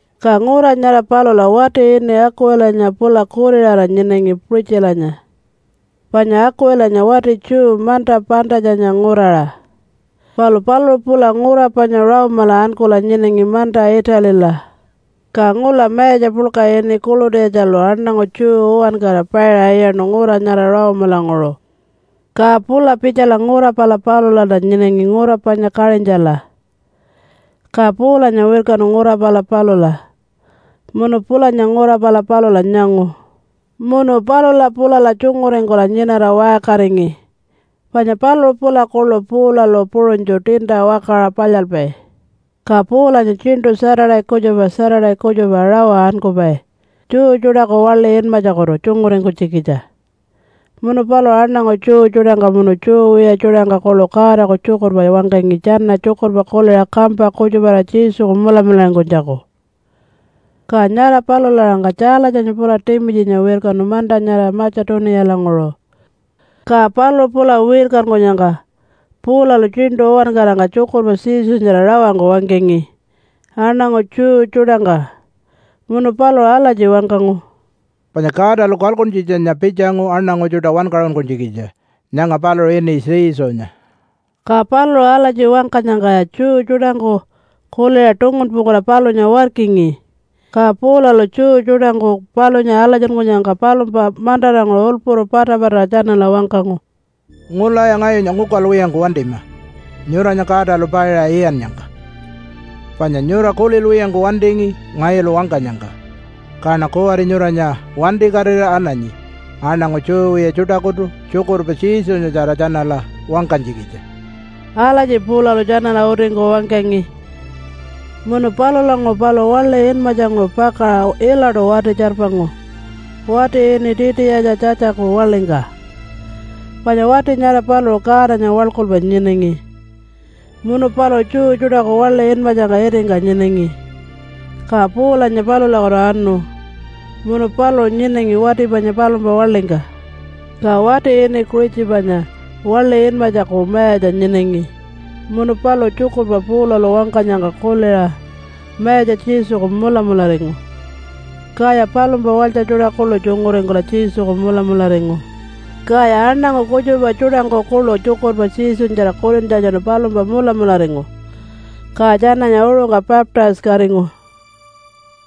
Ka ngura nyara palula wati ini Akuwilanya pula kuriṟara nyinangi Puṟitjilanya, panya Akuwilanya wati Jew manta Pantatjanya nguraṟa, palu paluṟu pula ngura panya Rome-ala ankula nyinangi manta Italila. Ka ngula mayatja puḻka ini Kulutiyatjalu aṉangu Jew uwankara paiṟa iyaṉu ngura nyara Rome-languṟu, ka pula pitjala ngura pala palulalta nyinangi ngura panya Kaṟintjala. Ka Paulanya wirkanu ngura pala palula munu pulanya ngura pala palula nyangu. Munu palula pulala tjunguringkula nyinara waṟkaringi, panya paluṟu pula kuḻu Paulalu puṟunytju tiinta wakaṟa palyalpai. Ka Paulanya tjiṉṯu Saturday kutjupa Saturday kutjupa rawa ankupai Jew tjuṯaku waḻi inmatjakutu tjunguringkunytjikitja munu paluṟu aṉangu Jew tjuṯangka munu Jew wiya tjuṯangka kuḻu Godaku tjukurpa wangkangi tjana tjukurpa kuliṟa kampa kutjuparira Jesuku mulamularingkunytjaku. Ka nyara palula-aṟangka Tjaalatjanya pula Timitjinya wirkanu manta nyara Matja-tuniyalanguṟu. Ka paluṟu pula wirkankunyangka, Paulalu tjiṉṯu uwankarangka tjukurpa Jesunyatjara rawangku wangkangi aṉangu Jew tjuṯangka, munu paluṟu alatji wangkangu, “Panya Godalu kalkuntjitjanya pitjangu aṉangu tjuṯa wankaṟunkunytjikitja. Nyanga paluṟu ini Jesunya.” Ka paluṟu alatji wangkanyangkaya Jew tjuṯangku kuliṟa tungunpungkula palunya warkingi. Ka Paulalu Jew tjuṯangku palunya alatjingannyangka palumpa mantaranguṟu ulpuru patapataṟa tjanala wangkangu, “Ngulaya ngayunya ngukalwiyangku wantima nyuranya Godalu paiṟa iyannyangka. Panya nyura kulilwiyangku wantingi ngayulu wangkanyangka. Kaṉa kuwari nyuranya wantikatira ananyi aṉangu Jew wiya tjuṯakutu tjukurpa Jesunyatjara tjanala wangkanytjikitja.” Alatji Paulalu tjanala utingku wangkangi. Munu palulanguṟu paluṟu waḻi inmatjanguṟu pakaṟa ilaṯu wati-tjarpangu, wati ini Titiyatja Tjatjaku waḻingka, panya wati nyara paluṟu Godanya waḻkulpai nyinangi, munu paluṟu Jew tjuṯaku waḻi inmatjangka itingka nyinangi. Ka Paulanya palulakutu anu, munu paluṟu nyinangi wati panya palumpa waḻingka. Ka wati ini Kuṟitjipanya waḻi inmatjaku mayatja nyinangi munu paluṟu tjukurpa Paulalu wangkanyangka kuliṟa Mayatja Jesuku mulamularingu. Kaya palumpa walytja tjuṯa kuḻu tjunguringkula Jesuku mulamularingu. Kaya aṉangu kutjupa tjuṯangku kuḻu tjukurpa Jesunyatjara kulintjatjanu palumpa mulamularingu, ka tjananya uṟungka baptise-katingu.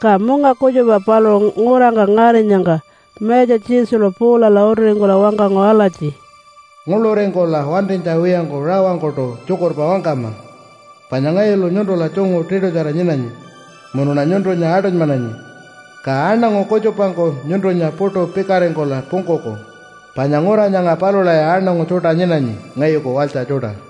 Ka munga kutjupa paluṟu ngurangka ngarinyangka Mayatja Jesulu Paulala utiringkula wangkangu alatji, “Nguḻuringkula wantinytja wiyangku rawangkuṯu tjukurpa wangkama. Panya ngayulu nyuntula tjungu tiṯutjara nyinanyi munuṉa nyuntunya aṯunymananyi, ka aṉangu kutjupangku nyuntunya puṯu pikaringkula pungkuku, panya ngura nyanga palulaya aṉangu tjuṯa nyinanyi ngayuku walytja tjuṯa.”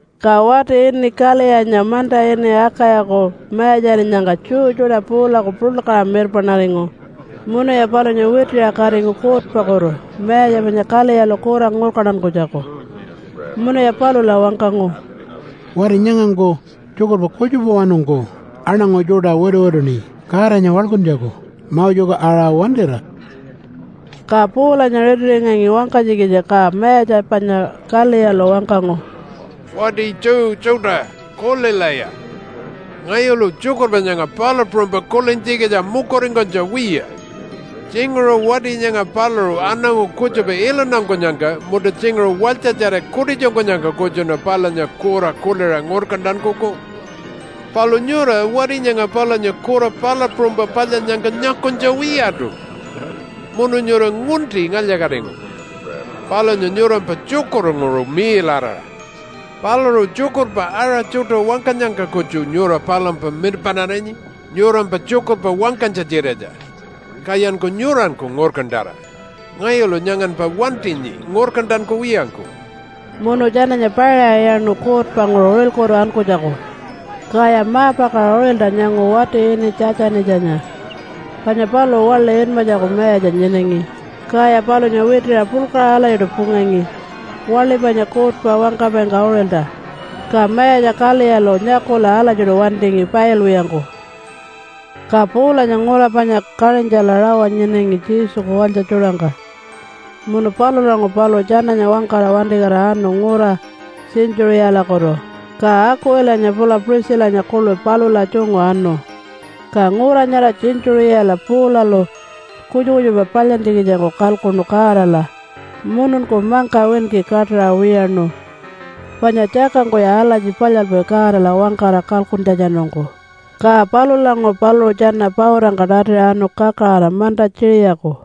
Ka wati ini Kaliyanya manta ini Akayaku mayatjarinyangka Jew tjuṯa Paulaku puḻkaṟa mirpaṉaringu munuya palunya witiṟa katingu kuutpakutu mayatja panya Kaliyalu kura ngurkantankunytjaku. Munuya palula wangkangu, “Wati nyangangku tjukurpa kutjupawanungku aṉangu tjuṯa wituwituṉi Godanya waḻkuntjaku Moseku aṟa wantira.” Ka Paulanya ritiringangi wangkanytjikitja ka mayatja panya Kaliyalu wangkangu, “Wati Jew tjuṯa, kulilaya! Ngayulu tjukurpa nyanga palu puṟunypa kulintjikitja mukuringkunytja wiya. Tjinguṟu wati nyanga paluṟu aṉangu kutjupa iluntankunyangka munta tjinguṟu walytjatjara kutitjunkunyangka kutjuṉa palunya kura kuliṟa ngurkantankuku. Palu nyura wati nyanga palunya kura palu puṟunypa palyannyangka nyakunytja wiyaṯu munu nyura ngunti ngalya-katingu palunya nyurampa tjukurnguṟu miiḻaraṟa. Paluṟu tjukurpa aṟa tjuṯa wangkanyangka kutju nyura palumpa mirpaṉarinyi nyurampa tjukurpa wangkanytja-tjiratja, kayanku nyuranku ngurkantara! Ngayulu nyanganpa wantinyi ngurkantankuwiyangku.” Munu tjananya paiṟa iyaṉu kuutpanguṟu uṟilkutu ankunytjaku. Kaya ma-pakaṟa uṟilta nyangu wati ini Tjatjanitjanya panya paluṟu waḻi inmatjaku mayatja nyinangi. Kaya palunya witiṟa puḻkaṟa alatjiṯu pungangi waḻi panya kuutpa wangkapaingka uṟilta, ka mayatja Kaliyalu nyakula alatjiṯu wantingi pailwiyangku. Ka Paulanya ngura panya Kaṟintjala rawa nyinangi Jesuku walytja tjuṯangka. Munu palulanguṟu paluṟu tjananya wangkara wantikatira anu ngura Tjintjuṟiyalakutu, ka Akuwilanya pula Puṟitjilanya kuḻu palula tjungu anu. Ka ngura nyara Tjintjuṟiyala Paulalu kutjupa kutjupa palyantjikitjangku kalkuṉu Godala mununku mangka winki kaṯaṟa wiyaṉu, panya tjakangkuya alatji palyalpai Godala wangkara kalkuntjatjanungku. Ka palulanguṟu paluṟu tjana pautangka tatiṟa anu kakaraṟa manta Tjiṟiyaku.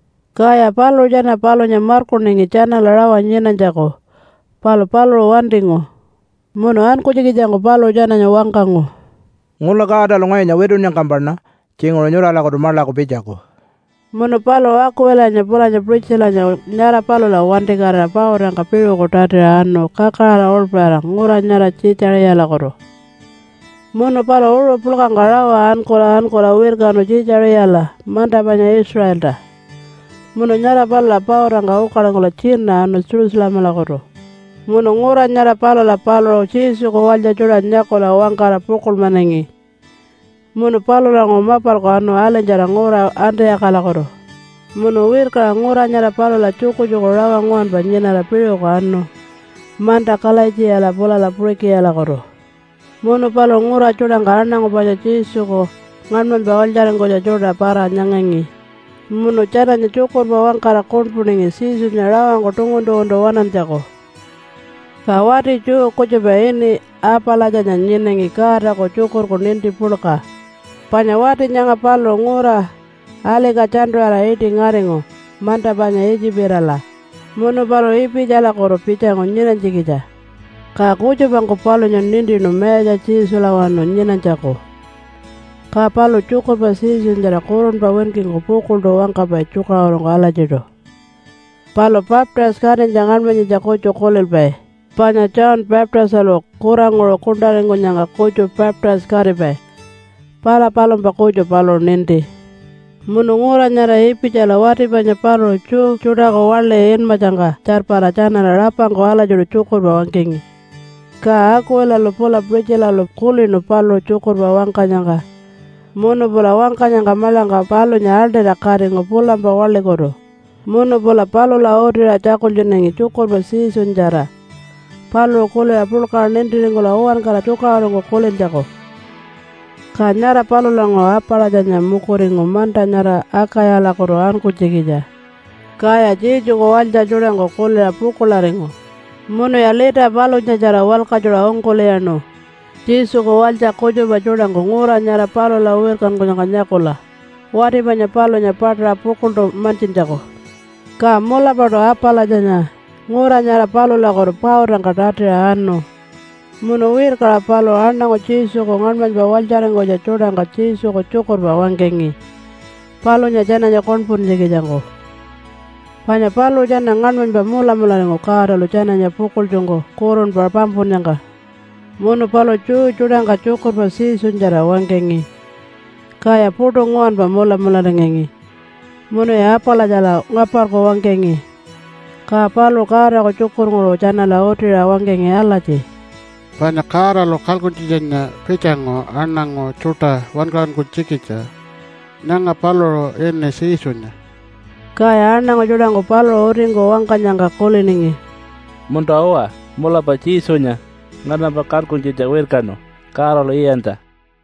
Kaya paluṟu tjana palunya markuningi tjanala rawa nyinanytjaku, palu paluṟu wantingu. Munu ankunytjikitjangku paluṟu tjananya wangkangu, “Ngula Godalu ngayunya witunnyangkampaṉa tjinguṟu nyuralakutu maḻaku pitjaku.” Munu paluṟu Akuwilanya pulanya Puṟitjilanya nyara palula wantikatira pautangka piṟuku tatiṟa anu kakaraṟa uḻpaṟira ngura nyara Tjiitjaṟiyalakutu. Munu paluṟu uṟu puḻkangka rawa ankula ankula wirkanu Tjiitjaṟiyala manta panya Israelta, munu nyara palula pautanguṟu ukalingkula tjina anu Jerusalemalakutu. Munu ngura nyara palula paluṟu Jesuku walytja tjuṯa nyakula wangkara pukuḻmanangi. Munu palulanguṟu mapalku anu alinytjara ngura Antiyakalakutu. Munu wirkaṟa ngura nyara palula tjukutjuku rawa nguwanpa nyinara piṟuku anu manta Kalaitjiyala pulala Puṟikiyalakutu. Munu paluṟu ngura tjuṯangka aṉangu panya Jesuku ngaṉmanypa walytjaringkunytja tjuṯa para-nyangangi, munu tjananya tjukurpa wangkara kuṉpuningi Jesunya rawangku tungun-tunguntu waṉantjaku. Ka wati Jew kutjupa ini Apalatjanya nyinangi Godaku tjukurku ninti puḻka. Panya wati nyanga paluṟu ngura Alika-tjantu-ṟiyala iṯi ngaringu manta panya Itjipala munu paluṟu Ipitjalakutu pitjangu nyinanytjikitja. Ka kutjupangku palunya nintinu Mayatja Jesulawanu nyinanytjaku, ka paluṟu tjukurpa Jesunyatjara kurunpa winkingku pukuḻṯu wangkapai tjukaṟurungku alatjiṯu. Palu baptise-katinytja ngaṉmanyitja kutju kulilpai, panya John Baptistalu kuranguṟu kuṉṯaringkunyangka kutju baptise-katipai – pala palumpa kutju paluṟu ninti. Munu ngura nyara Ipitjala wati panya paluṟu Jew tjuṯaku waḻi inmatjangka tjarpara tjanala rapangku alatjiṯu tjukurpa wangkangi. Ka Akuwilalu pula Puṟitjilalu kulinu paluṟu tjukurpa wangkanyangka munu pula wangkanyangka maḻangka palunya aḻṯira katingu pulampa waḻikutu munu pula palula utiṟa tjakultjunangi tjukurpa Jesunyatjara paluṟu kuliṟa puḻkaṟa nintiringkula uwankara tjukaṟurungku kulintjaku. Ka nyara palulanguṟu Apalatjanya mukuringu manta nyara Akayalakutu ankunytjikitja. Kaya Jesuku walytja tjuṯangku kuliṟa pukuḻaringu, munuya lita palunyatjara walkatjuṟa ungkul'iyaṉu, Jesuku walytja kutjupa tjuṯangku ngura nyara palula wirkankunyangka nyakula, wati panya palunya paṯaṟa pukuḻṯu mantjintjaku. Ka mulapaṯu Apalatjanya ngura nyara palulakutu pautangka tatiṟa anu, munu wirkaṟa paluṟu aṉangu Jesuku ngaṉmanypa walytjaringkunytja tjuṯangka Jesuku tjukurpa wangkangi, palunya tjananya kuṉpuntjikitjangku, panya paluṟu tjana ngaṉmanypa mulamularingu Godalu tjananya pukuḻtjungku kurunpa pampunnyangka. Munu paluṟu Jew tjuṯangka tjukurpa Jesunyatjara wangkangi, kaya puṯu nguwanpa mulamularingangi munuya Apalatjala ngaparku wangkangi. Ka paluṟu Godaku tjukurnguṟu tjanala utiṟa wangkangi alatji, “Panya Godalu kalkuntjitjanya pitjangu aṉangu tjuṯa wankaṟunkunytjikitja. Nyanga paluṟu ini Jesunya.” Kaya aṉangu tjuṯangku paluṟu utingku wangkanyangka kuliningi, “Munta-uwa, mulapa Jesunya nganampa kalkuntjitja wirkanu Godalu iyantja.”